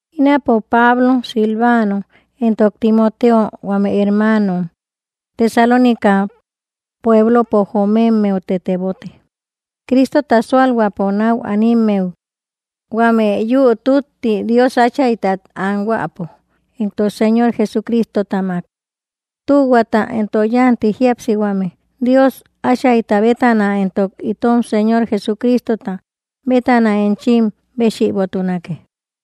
Ínapo, Pablo, Silvano, éntok Timoteo, huame hermanom Tesalónica pueblopo jomemmeute tebote Cristota sualhuäpo nau animmehui huame yüu tütti Dios Áchaytat anhuäpo éntok Señor Jesucristotamak. Tühuata éntok yanti jíapsihuame Dios Áchayta bétana éntok itom Señor Jesucristota bétana enchim béchïbotunake.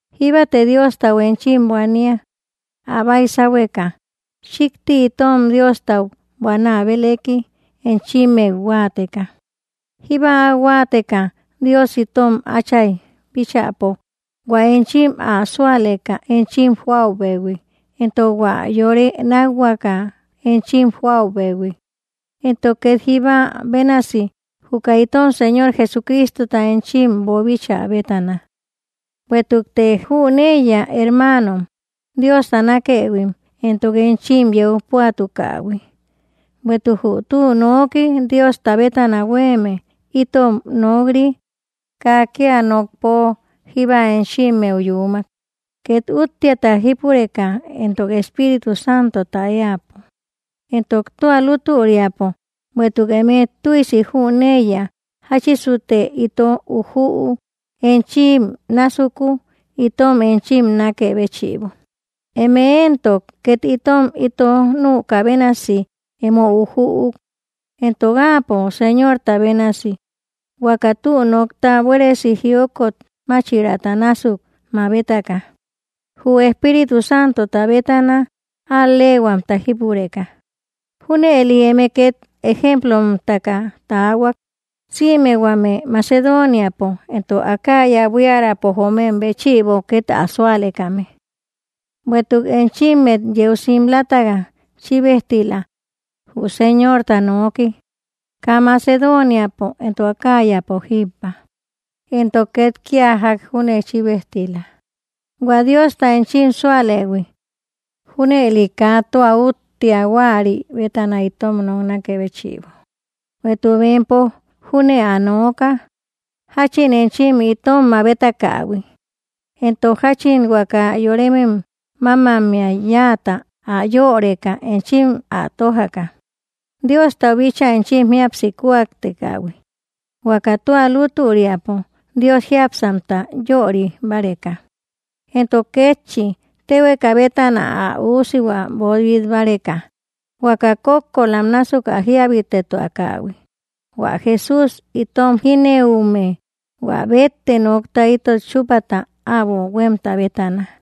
Jíbate Diostau enchim buania, ä baisahueka, chíkti itom Diostau buanä bélëki enchimmeu huáateka, jíba áu huáateka Dios itom Áchay bíchäpo hua enchim ä súaleka enchim joäubehui, entok hua yore nákhuaka enchim joäubehui, entok két jíba bénasi juka itom Señor Jesucristota enchim boobíchä bétana. Bueïtukte jüneiya, hermaanom, Diosta nákëhuim, entok enchim yeu púatukähui, bueïtuk jü tü nooki Diosta bétana huéeme itom nok‑ri kaa kía nokpo jíba enchimmeu yuumak, két útteata jípureka, entok Espíritu Santota éäpo, entok tua lútüriapo, bueïtuk eme tüisi jüneiya jáchisute ito ujüuk enchim násuku, itom enchim nákë béchïbo. Eme éntok két itom ito nükä bénasi emo ujüuk, entok Áapo Señorta bénasi, huaka tü nokta buéresi jiokot máchiraata násuk mabetaka, jü Espíritu Santota bétana al‑leehuamta jípureka. Júnëli eme két ejemplomtaka taahuak, sïme huame Macedoniapo entok Acaya buiärapo joomem béchïbo, két ä súalekame. Bueïtuk enchimmet yeu simlataka chíbejtila jü Señorta nooki, kaa Macedoniapo entok Acayapo jíbba, entok két kía ják júne chíbejtila, hua Diosta enchim súalëhui. Júnëli kaa tua úttea huäri bétana itom noknakë béchïbo, bueïtuk bempo júne ä nooka, jáchin enchim itom mabetakähui, éntok jáchin huaka yorem mámammey yáata ä yöreka enchim ä tójaka Diostau bíchaa enchim jíapsi kúaktekähui, huaka tua lútüriapo Dios jiápsamta yöri báreka, entok kétchi, téhueka bétana ä Üusihua boobit báreka, huaka kókkolam násuk ä jíabitetuakähui, hua Jesús, itom jínëume, hua bétte nokta itot chúpata äbo huémta bétana.